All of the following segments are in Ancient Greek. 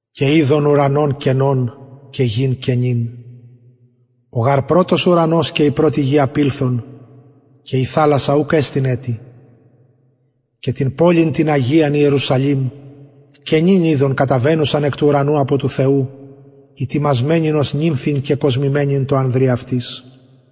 και ειδον ουρανον καινον και γην καινην ο γαρ πρωτος ουρανος και η πρωτη γη απηλθον και η θαλασσα ουκ εστιν ετι και την πολιν την αγιαν ιερουσαλημ καινην ειδον καταβαινουσαν εκ του ουρανου απο του θεου ητοιμασμενην ως νυμφην κεκοσμημενην τω ανδρι αυτης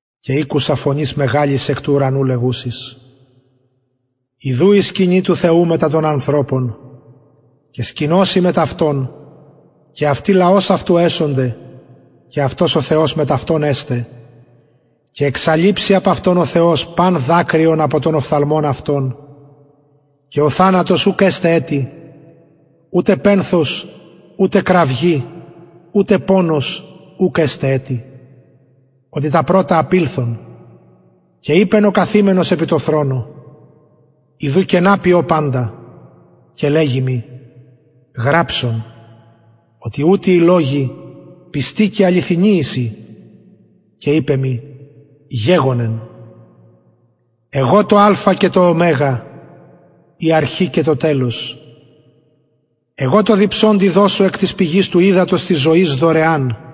και ηκουσα φωνης μεγαλης εκ του ουρανου λεγουσης ιδου η σκηνη του θεου μετα των ανθρωπων και σκηνωσει μετ αυτων και αυτοι λαος αυτου εσονται και αυτος ο θεος εσται μετ αυτων και εξαλειψει παν δακρυον απο των οφθαλμων αυτων και ο θανατος ουκ εσται ετι ουτε πενθος ουτε κραυγη ουτε πονος ουκ εσται ετι οτι τα πρωτα απηλθον και ειπεν ο καθημενος επι τω θρονω ιδου παντα καινα ποιω και λεγει μοι γραψον οτι ουτοι οι λογοι αληθινοι και πιστοι εισιν και ειπεν μοι γεγονα το αλφα και το ω η αρχη και το τελος εγω τω διψωντι δωσω εκ της πηγης του υδατος της ζωης δωρεαν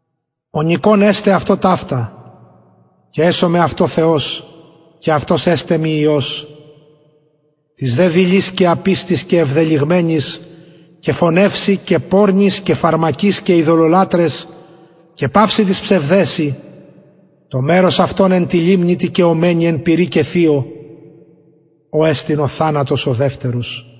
ο νικων κληρονομησει ταυτα και εσομαι αυτω θεος και αυτος εσται μοι υιος τοις δε δειλοις και απιστοις και αμαρτωλοις και εβδελυγμενοις και φονευσιν και πορνοις και φαρμακοις και ειδωλολατραις και πασιν τοις ψευδεσιν το μερος αυτων εν τη λιμνη τη καιομενη πυρι και θειω ο εστιν ο θανατος ο δευτερος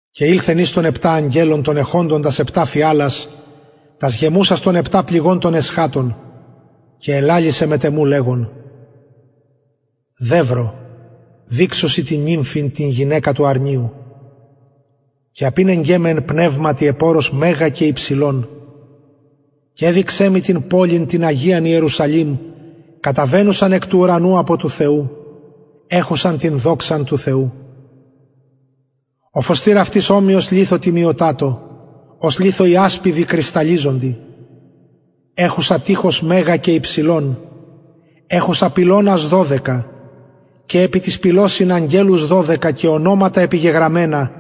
και ηλθεν εις εκ των επτα αγγελων των εχοντων τας επτα φιαλας γεμουσας των επτα πληγων των εσχατων και ελαλησεν μετ εμου λεγων δευρο δειξω σοι την γυναικα την νυμφην του αρνιου και απηνεγκεν με εν πνευματι επ ορος μεγα και υψηλον και εδειξεν μοι την πολιν την μεγαλην την αγιαν ιερουσαλημ καταβαινουσαν εκ του ουρανου απο του θεου εχουσαν την δοξαν του θεου ο φωστηρ αυτης ομοιος λιθω τιμιωτατω ως λιθω ιασπιδι κρυσταλλιζοντι εχουσα τειχος μεγα και υψηλον εχουσα πυλωνας δωδεκα και επι τοις πυλωσιν αγγελους δωδεκα και ονοματα επιγεγραμμενα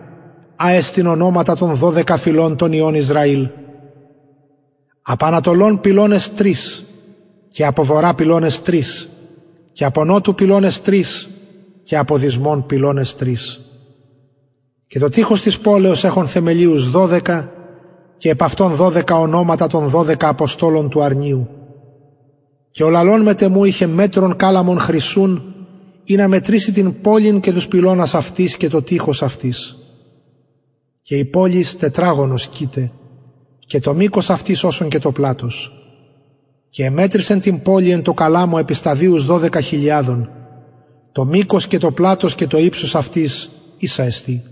α εστιν ονοματα των δωδεκα φυλων των υιων ισραηλ απο ανατολων πυλωνες τρεις και απο βορρα πυλωνες τρεις και απο νοτου πυλωνες τρεις και απο δυσμων πυλωνες τρεις και το τειχος της πολεως εχον θεμελιους δωδεκα και επ αυτων δωδεκα ονοματα των δωδεκα αποστολων του αρνιου και ο λαλων μετ εμου ειχεν μετρον καλαμον χρυσουν ινα μετρηση την πολιν και τους πυλωνας αυτης και το τειχος αυτης και η πολις τετραγωνος κειται και το μηκος αυτης οσον το πλατος και εμετρησεν την πολιν τω καλαμω επι σταδιους δωδεκα χιλιαδων δωδεκα το μηκος και το πλατος και το υψος αυτης ισα εστιν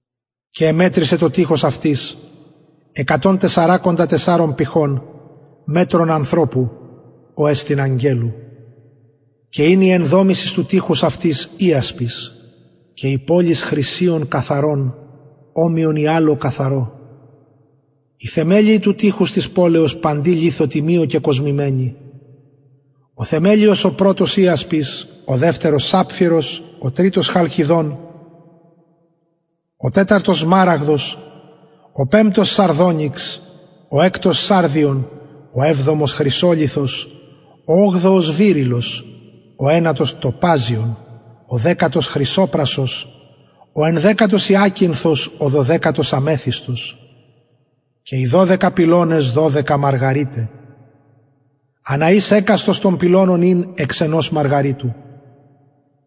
και εμετρησεν το τειχος αυτης εκατον τεσσαρακοντα τεσσαρων πηχων μετρον ανθρωπου ο εστιν αγγελου και ην η ενδομησις του τειχους αυτης ιασπις και η πολις χρυσιον καθαρον ομοιον υελω καθαρω οι θεμελιοι του τειχους της πολεως παντι λιθω τιμιω κεκοσμημενοι ο θεμελιος ο πρωτος ιασπις ο δευτερος σαπφειρος ο τριτος χαλκηδων ο τεταρτος σμαραγδος ο πεμπτος σαρδονυξ ο εκτος σαρδιον ο εβδομος χρυσολιθος ο ογδοος βηρυλλος ο ενατος τοπαζιον ο δεκατος χρυσοπρασος ο ενδεκατος υακινθος ο δωδεκατος αμεθυσος και οι δωδεκα πυλωνες δωδεκα μαργαριται ανα εις εκαστος των πυλωνων ην εξ ενος μαργαριτου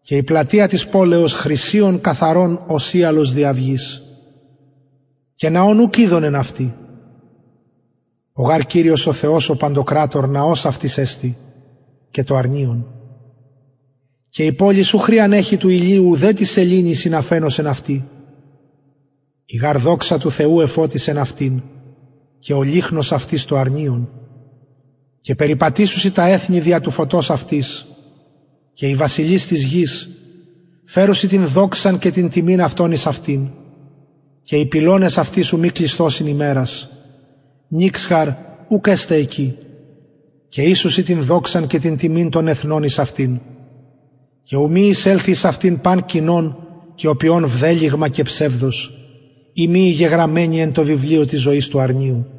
και η πλατεια της πολεως χρυσιον καθαρον ως υελος διαυγης και ναον ουκ ειδον εν αυτη ο γαρ κυριος ο θεος ο παντοκρατωρ ναος αυτης εστιν και το αρνιον και η πολις ου χρειαν εχει του ηλιου ουδε της σεληνης ινα φαινωσιν αυτη η γαρ δοξα του θεου εφωτισεν αυτην και ο λυχνος αυτης το αρνιον και περιπατησουσιν τα εθνη δια του φωτος αυτης και οι βασιλεις της γης φερουσιν αυτω δοξαν και τιμην των εθνων εις αυτην και οι πυλωνες αυτης ου μη κλεισθωσιν ημερας νυξ γαρ ουκ εσται εκει και οισουσιν την δοξαν και την τιμην των εθνων εις αυτην και ου μη εισελθη εις αυτην παν κοινον και ποιουν βδελυγμα και ψευδος ει μη οι γεγραμμενοι εν τω βιβλιω της ζωης του αρνιου